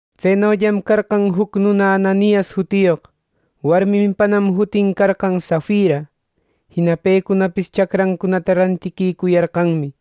Tsenollam carqan juc nuna Ananias jutiyoq; warminpanam jutin carqan Safira. Jina pecunapis chacrancunata rantiquicuyarqanmi.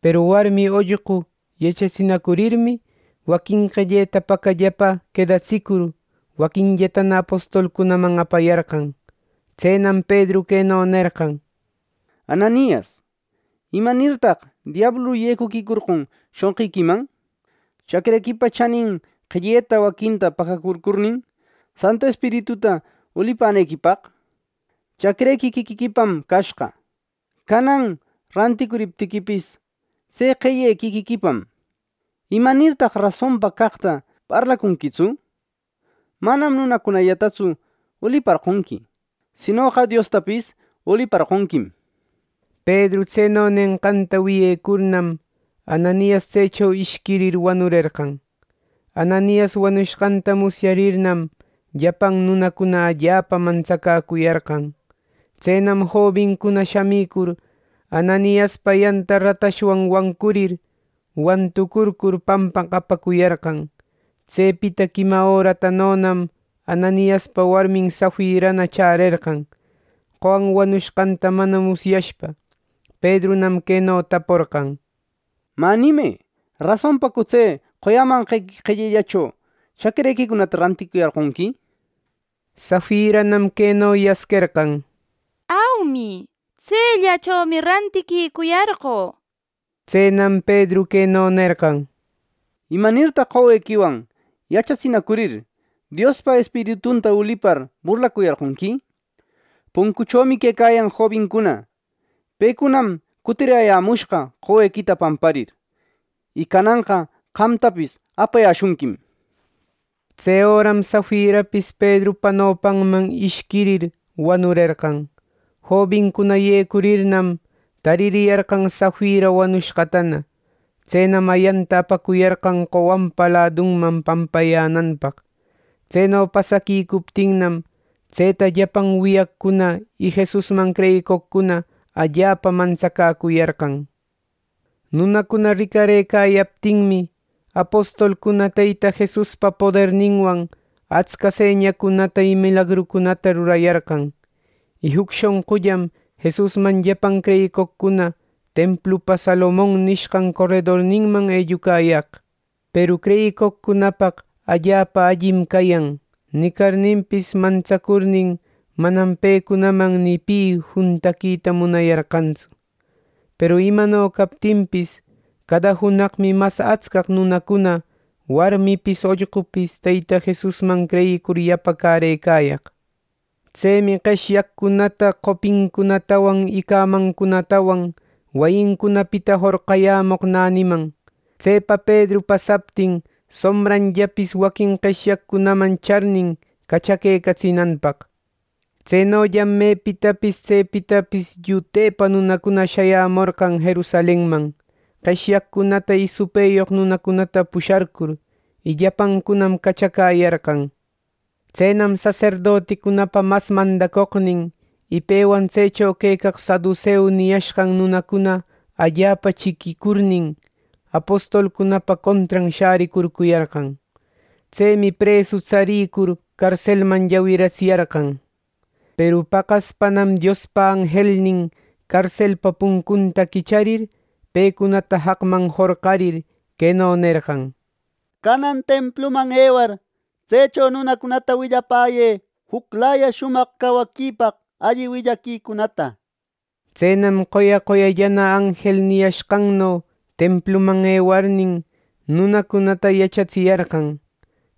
Peru warmi ollqu yachatsinacurirmi, waquin qelleta pacallapa quedatsicur, waquinllatana apostolcunaman apayarqan. Tsenam Pedru queno nerqan: —Ananias, ¿imanirtaq diablu yecuquicorqon shonqiquiman, chacrequipa chänin qelleta waquinta pacacurcurnin, Santu Espirituta ulipänequipaq? Chacrequi quiquiquipam cashqa. Canan ranticuriptiquipis, tse qelle quiquiquipam. ¿Imanirtaq rasonpa caqta parlacunquitsu! Manam nunacunallatatsu uliparqonqui; sinoqa Diosta uliparqonquim. Pedru tseno nenqanta wiyecurnam, Ananias tsecho ishquirir wanurerqan. Ananias wanushqanta musyarirninnam, llapan nunacuna allapa mantsacäcuyarqan. Tsenam jobincuna shamicur, Ananiaspa ayanta ratashwan wancurir, wanturcur pampaq apacuyarqan. Tsepita quima öratanonam Ananiaspa warmin Safirana chärerqan, qowan wanushqanta mana musyashpa. Pedrunam queno taporqan: —Mä nimë, ¿rasonpacu tse qoyämanqequi qellellacho chacrequicunata ranticuyarqonqui? —nishpa. Safiranam queno yasquerqan: —Aumi, tsellachomi rantiquicuyarqö —nishpa. Tsenam Pedru queno nerqan: —¿Imanirtaq qowequiwan yachatsinacurir, Diospa Espiritunta ulipar burlacuyarqonqui! Puncuchomi quecayan jobincuna; pecunam cutirayämushqa qowequita pamparir; y cananqa qamtapis apayäshunquim. Tse öram Safirapis Pedrupa nopanman ishquirir, wanurerqan. Jobincuna yecurirnam, taririyarqan Safira wanushqatana. Tsenam ayanta apacuyarqan qowanpa ladunman pampayänanpaq. Tseno pasaquicuptinnam, tseta llapan wiyaqcuna y Jesusman creyicoqcuna allapa mantsacäcuyarqan. Nunacuna ricarëcayaptinmi, apostolcuna Teyta Jesuspa poderninwan atsca señacunata y milagrucunata rurayarqan. Y juc shonqullam Jesusman llapan creyicoqcuna templupa Salomon nishqan coredorninman ellucayaq. Peru creyicoqcunapaq “allapa allim cayan” nicarninpis mantsacurnin, manam pecunaman ni pi juntaquita munayarqantsu. Peru imano captinpis, cada junaqmi mas atscaq nunacuna, warmipis ollqupis, Teyta Jesusman creyicur yapacärëcayaq. Tsemi qeshyaqcunata qopincunatawan y cämancunatawan wayincunapita jorqayämoq näniman, tsepa Pedru pasaptin, sombranllapis waquin qeshyaqcunaman charnin, cachaquecatsinanpaq. Tsenollam mepitapis tsepitapis llutepa nunacuna shayämorqan Jerusalenman, qeshyaqcunata y supëyoq nunacunata pusharcur; y llapancunam cachacäyarqan. Tsenam saserdoticunapa mas mandacoqnin y pewan tsecho quecaq saduseu niyashqan nunacuna allapa chiquicurnin, apostolcunapa contran shäricurcuyarqan. Tsemi presu tsarïcur carselman llawiratsiyarqan. Peru paqaspanam Diospa anjelnin carselpa puncunta quicharir, pecunata jaqman jorqarir, queno nerqan: “Canan templuman ewar, tsecho nunacunata willapäyë juclaya shumaq cawaquipaq alli willaquicunata.” Tsenam qoya qoyallana anjel niyashqanno templuman ewarnin, nunacunata yachatsiyarqan.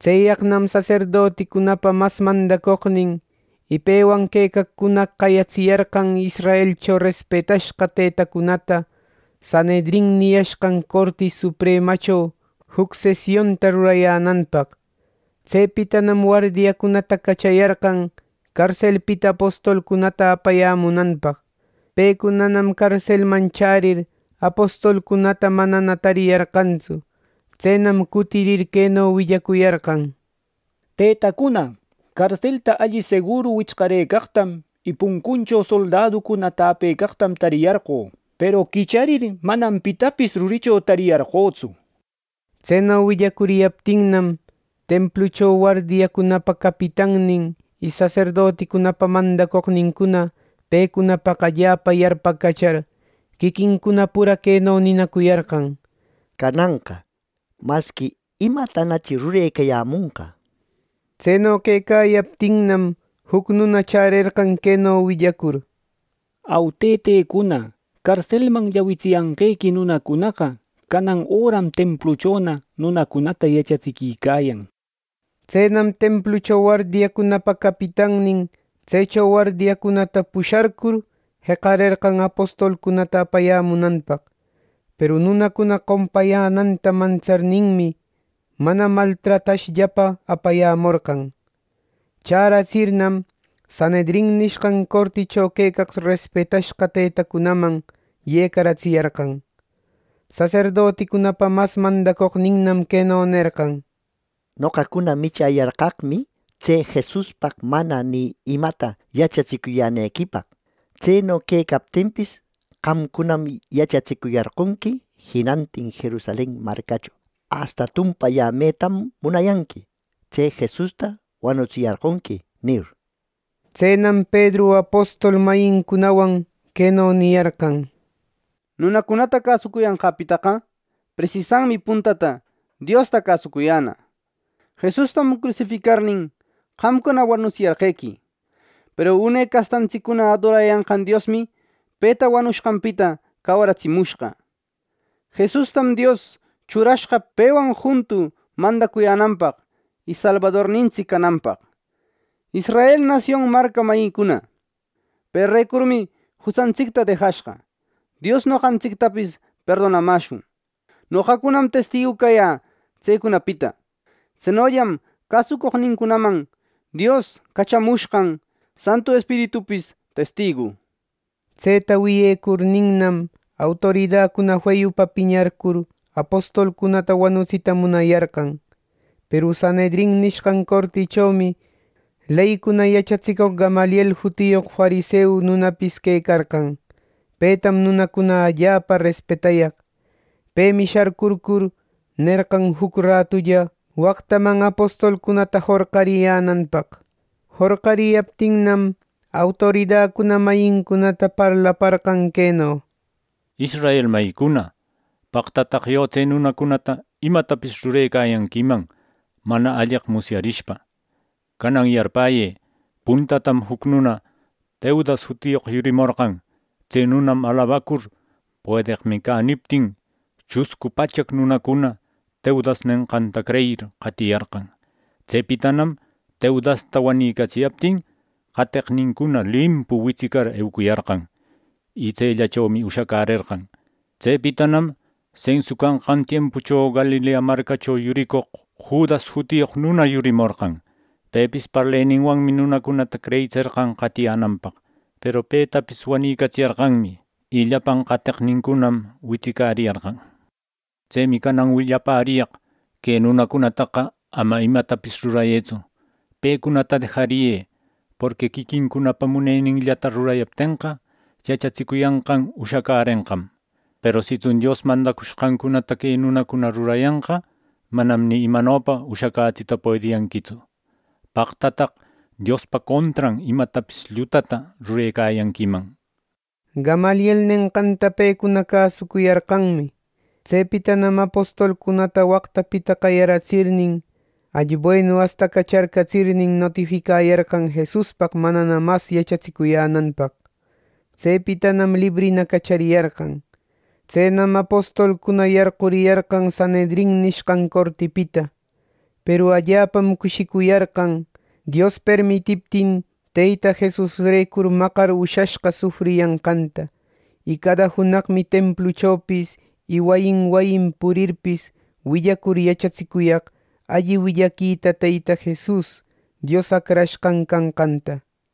Tseyaqnam saserdoticunapa mas mandacoqnin y pewan quecaqcuna qayatsiyarqan Israelcho respetashqa tëtacunata Sanhedrin niyashqan Corti Supremacho juc sesionta rurayänanpaq. Tsepitanam wardiacunata cachayarqan carselpita apostolcunata apayämunanpaq. Pecunanam carselman chärir, apostolcunata manana tariyarqantsu. Tsenam cutirir, queno willacuyarqan: —Tëtacuna, carselta alli seguru wichcarëcaqtam y puncucho soldaducuna täpecaqtam tariyarqö. Peru quicharir, manam pitapis ruricho tariyarqötsu —nishpa. Tseno willacuriyaptinnam, templucho wardiacunapa capitannin y saserdoticunapa mandacoqnincuna pecunapaq allapa yarpacachar, quiquincuna pura queno ninacuyarqan: —Cananqa, ¿masqui imatanachi rurecayämonqa! —nishpa. Tseno quecayaptinnam, juc nuna chärerqan queno willacur: —Au, tëtacuna, carselman llawitsiyanqequi nunacunaqa canan öram templuchona nunacunata yachatsiquicayan —nishpa. Tsenam templucho wardiacunapa capitannin tsecho wardiacunata pusharcur, jeqarerqan apostolcunata apayämunanpaq. Peru nunacuna qompayänanta mantsarninmi, mana maltratashllapa apayämorqan. Chäratsirnam, Sanhedrin nishqan corticho quecaq respetashqa tëtacunaman yecaratsiyarqan. Saserdoticunapa mas mandacoqninnam queno nerqan: —Noqacuna michäyarqaqmi tse Jesuspaq mana ni imata yachatsicuyänequipaq. Tseno quecaptinpis, qamcunam yachatsicuyarqonqui jinantin Jerusalen marcacho, asta tumpayämetam munayanqui, ‘Tse Jesusta wanutsiyarqonqui’ nir. Tsenam Pedru apostol mayincunawan queno niyarqan: —Nunacunata cäsuyanqäpitaqa, presisanmi puntata Diosta cäsucuyänä. Jesustam crusificarnin, qamcuna wanutsiyarqequi. Peru une castantsiccuna adorayanqan Diosmi peta wanushqanpita cawaritsimushqa. Jesustam Dios churashqa pewan juntu mandacuyänanpaq y Salbadornintsic cananpaq. Israel nasion marca mayicuna, perecurmi jutsantsicta dejashqa, Dios noqantsictapis perdonamäshun. Noqacunam testigu cayä tsecunapita. Tsenollam cäsucoqnincunaman Dios cachamushqan Santu Espiritupis testigu. Tseta wiyecurninnam, autoridacuna feyupa piñarcur apostolcunata wanutsita munayarqan. Peru Sanhedrin nishqan cortichomi leycuna yachatsicoq Gamaliel jutiyoq fariseu nunapis quecarqan. Petam nunacuna allapa respetayaq. Pemi sharcurcur, nerqan juc ratulla waqtaman apostolcunata jorqariyänanpaq. Jorqariyaptinnam, autorida mayincunata parlaparqan queno: —Israel mayïcuna, ¡paqtataq yo tse nunacunata imatapis rurecuyanquiman, mana alleq musyarishpa! Canan yarpäyë: Puntatam juc nuna Teudas jutiyoq yurimorqan. Tse nunam alabacur ‘Puedeqmi cä’ niptin, chuscu pachaq nunacuna Teudas nenqanta creyir, qatiyarqan. Tsepitanam Teudasta wanïcatsiyaptin, qateqnincuna limpu witsicar eucuyarqan. Y tsellachomi ushacärerqan. Tsepitanam sensu canqan tiempucho Galilea marcacho yuricoq Judas jutiyoq nuna yurimorqan. Pepis parleninwanmi nunacunata creyitserqan qatiräyänanpaq. Peru petapis wanicatsiyarqanmi; y llapan qateqnincunam witsicariyarqan. Tsemi canan willapäriyaq. Que nunacunataqa ama imatapis rurayëtsu. Pecunata dejariyë; porqui quiquincunapa muneninllata rurayaptenqa, yachatsicuyanqan ushacärenqam. Peru sitsun Dios mandacushqancunata que nunacuna rurayanqa, manam ni imanopa ushacätsita puediyanquitsu. ¡Paqtataq, Diospa contran imatapis llutata rurecayanquiman! —nishpa. Gamaliel nenqanta pecuna cäsucuyarqanmi. Tsepitanam apostolcunata waqtapita qayaratsirnin, alli buenu astacacharcatsir, notificayarqan Jesuspaq manana mas yachatsicuyänanpaq. Tsepitanam librina cachariyarqan. Tsenam apostolcuna yarquriyarqan Sanhedrin nishqan cortipita. Peru allapam cushicuyarqan, Dios permitiptin Teyta Jesusrecur maqar ushashqa sufriyanqanta. Y cada junaqmi templuchopis y wayin wayin purirpis, willacur yachatsicuyaq alli willaquita Teyta Jesus Dios Acrashqan canqanta.